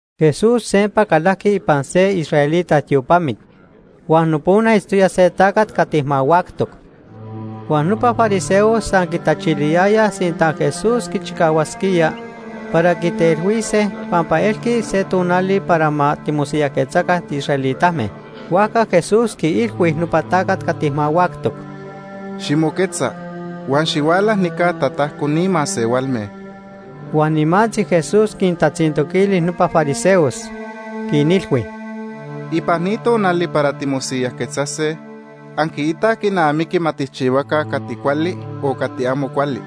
Jesús sempa calajqui ipan se israelita tiopamit, huan nopona itztoya se tacat cati mahuactoc. Huan nopa fariseos san quitachiliyayaj sinta Jesús quichicahuasquía para quitelhuise pampa elqui se tonali para ma timosiyajquetzaca tiisraelitame. Huajca Jesús quiilhui nopa tacat cati mahuactoc: ―Ximoquetza huan xihuala nica tatajco ni masehualme. Huan nimantzi Jesús quintatzintoquili nopa fariseos, quinilhui: ―¿Ipan ni tonali para timosiyajquetzase anquiitaj quinamiqui ma tijchihuaca cati cuali o cati amo cuali?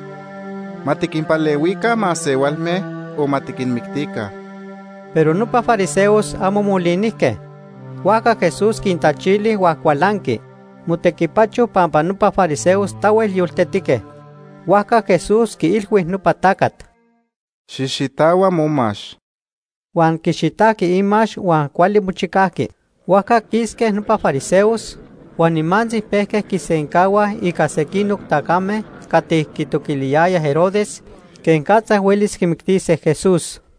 ¿Ma tiquinpalehuica masehualme o ma tiquinmictica? Pero nopa fariseos amo molinijque. Huajca Jesús quintachili huan cualanqui. Motequipacho pampa nopa fariseos tahuel yoltetique. Huajca Jesús quiilhui nopa tacat: ―¡Xijxitahua momax! Huan quixitajqui imax huan cuali mochicajqui. Huajca quisque nopa fariseos, huan nimantzi pejque quisencahuaj ica sequinoc tacame cati quitoquiliyayaj Herodes quenicatza huelis quimictise Jesús.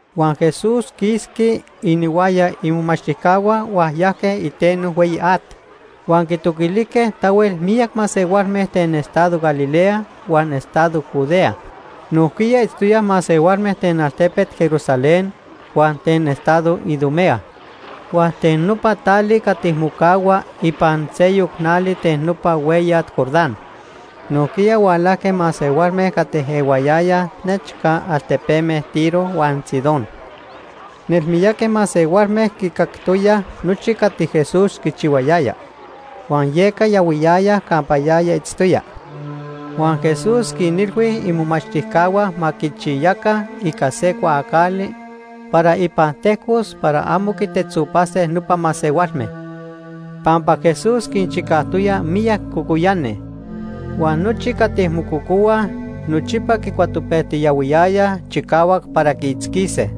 Huan Jesús quisqui ihuaya imomachtijcahua huan yajque iteno hueyi at. Huan quintoquilijque tahuel miyac masehualme ten estado Galilea huan estado Judea. Nojquiya itztoyaj masehualme ten altepet Jerusalén huan ten estado Idumea, huan ten nopa tali cati mocahua ipan seyoc nali ten nopa hueyat Jordán. Nojquiya hualajque masehualme cati ehuayayaj nechca altepeme Tiro huan Sidón. Nelmiyaqui masehualme quicactoyaj nochi cati Jesús quichihuayaya, huan yeca yahuiyayaj campa yaya itztoya. Huan Jesús quinilhui imomachtijcahua ma quichiyaca ica se cuaacali para ipan tejcos para amo quitetzopase nopa masehualme. Pampa Jesús quinchicajtoya miyac cocoyani huan nochi cati mococohuaj nochipa quicuatopejtiyahuiyayaj chicahuac para quiitzquise.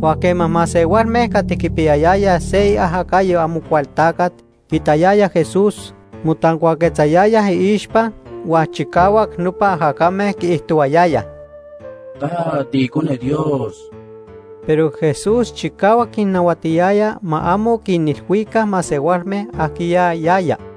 Huan quema masehualme cati quipiyayayaj se iajacayo Amocualtacat quiitayayaj Jesús, motancuaquetzayayaj iixpa huan chicahuac nopa ajacame quiijtohuayayaj: ―¡Ta tiIcone Dios! Pero Jesús chicahuac quinnahuatiyaya ma amo quinilhuica masehualme ajquiya yaya.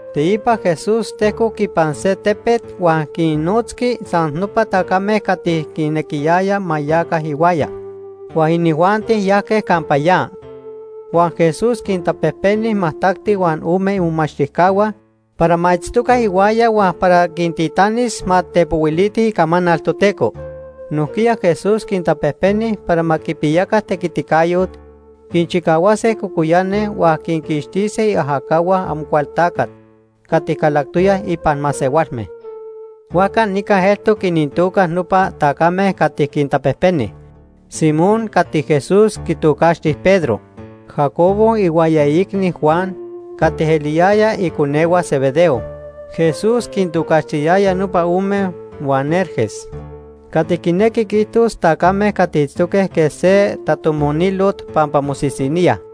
Teipa Jesús tejcoc ipan se tepet huan quinnotzqui san nopa tacame cati quinequiyaya ma yaca ihuaya, huan inijuanti yajque campa ya. Huan Jesús quintapejpeni majtacti huan ome imomachtijcahua para ma itztoca ihuaya huan para quintitanis ma tepohuilitij icamanal Toteco. Nojquiya Jesús quintapejpeni para ma quipiyaca tequiticayot quinchicahuase cocoyani huan quinquixtise iajacahua Amocualtacat cati calactoyaj ipan masehualme. Huajca nica eltoc inintoca nopa tacame cati quintapejpeni: Simón, cati Jesús quitocaxti Pedro, Jacobo ihuaya iicni, Juan, cati eliyayaj iconehua Zebedeo. Jesús quintocaxtiyaya nopa ome Boanerges, cati quinequi quiijtos tacame cati itztoque quej se tatomonilot pampa mosisiníaj.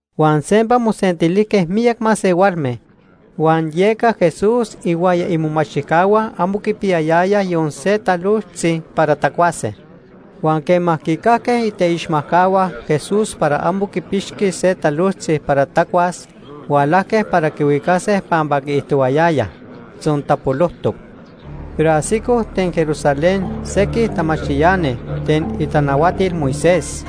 Huan sempa mosentilijque miyac masehualme, huan yeca Jesús ihuaya imomachtijcahua amo quipiyayayaj yon se talojtzi para tacuase. Huan quema quicajque iteixmatcahua Jesús para amo quipixqui se talojtzi para tacuas, hualajque para quihuicase pampa quiijtohuayayaj: “Tzontapolojtoc.” Pero ajsicoj ten Jerusalén sequij tamachtiani ten itanahuatil Moisés,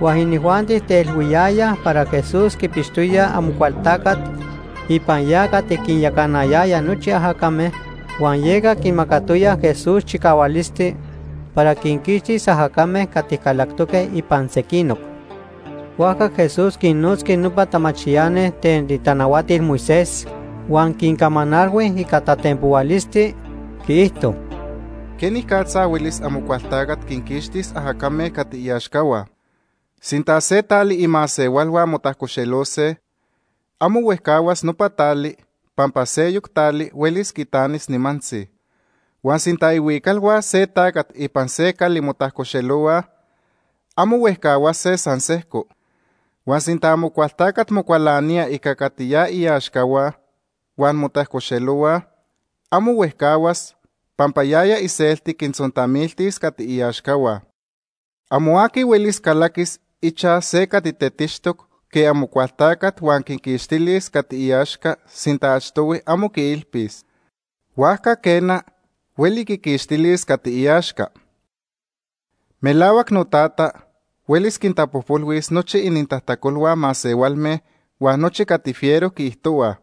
huan inijuanti teilhuiyayaj para Jesús quipixtoya Amocualtacat Nopa masehualme quitocaxtijque Amocualtacat, Beelzebú. ipan ya cati quinyacana nochi ajacame, huan yeca quimacatoya Jesús chicahualisti para quinquixtis ajacame cati calactoque ipan sequinoc. Huajca Jesús quinnotzqui nopa tamachtiani ten itanahuatil Moisés huan quincamanalhui ica tatenpohualisti, quiijto: “¿Quenicatza huelis Amocualtacat quinquixtis ajacame cati iaxcahua? Sinta se tali imasehualhua motajcoxelose, amo huejcahuas nopa tali pampa seyoc tali huelis quitanis nimantzi. Huan sinta ihuicalhua se tacat ipan se cali motajcoxelohuaj, amo huejcahuase san sejco. Huan sinta Amocualtacat mocualanía ica cati ya iaxcahua, huan motajcoxelohuaj, amo huejcahuas, pampa yaya iselti quintzontamiltis cati iaxcahua. “Amo aqui huelis calaquis ichaj se cati tetixtoc quej Amocualtacat huan quiquixtilis cati iaxca sinta achtohui amo quiilpis. Huajca quena, hueli quiquixtilis cati iaxca. “Melahuac noTata huelis quintapojpolhuis nochi inintajtacolhua masehualme huan nochi cati fiero quiijtohuaj,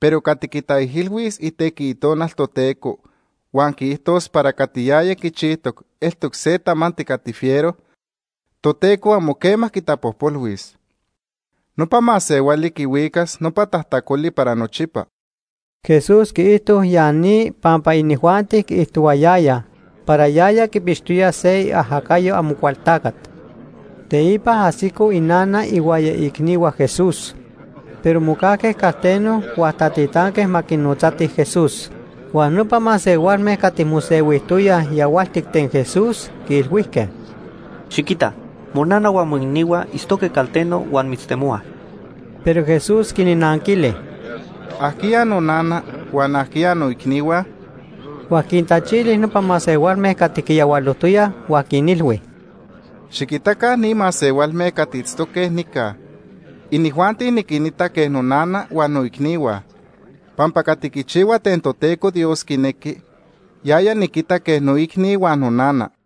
pero cati quitaijilhuis itequi Itonal Toteco huan quiijtos para cati yaya quichijtoc eltoc se tamanti cati fiero, Toteco amo quema quitapojpolhuis. Nopa masehuali quihuicas nopa tajtacoli para nochipa.” Jesús quiijto ya ni pampa inijuanti quiijtohuayayaj para yaya quipixtoya se iajacayo Amocualtacat. Teipa ajsico inana ihuaya iicnihua Jesús, pero mocajque calteno huan tatitanque ma quinotzatij Jesús. Huan nopa masehualme cati mosehuijtoyaj yahualtic ten Jesús, quiilhuijque: ―Xiquita, monana huan moicnihua itztoque calteno huan mitztemohuaj. Pero Jesús quinnanquili: ―¿Ajquiya nonana?, huan ¿ajquiya noicnihua? Huan quintachili nopa masehualme cati quiyahualojtoyaj huan quinilhui: ―Xiquitaca ni masehualme cati itztoque nica, inijuanti niquinita quej nonana huan noicnihua, pampa cati quichihua ten Toteco Dios quinequi, yaya niquita quej noicni huan nonana.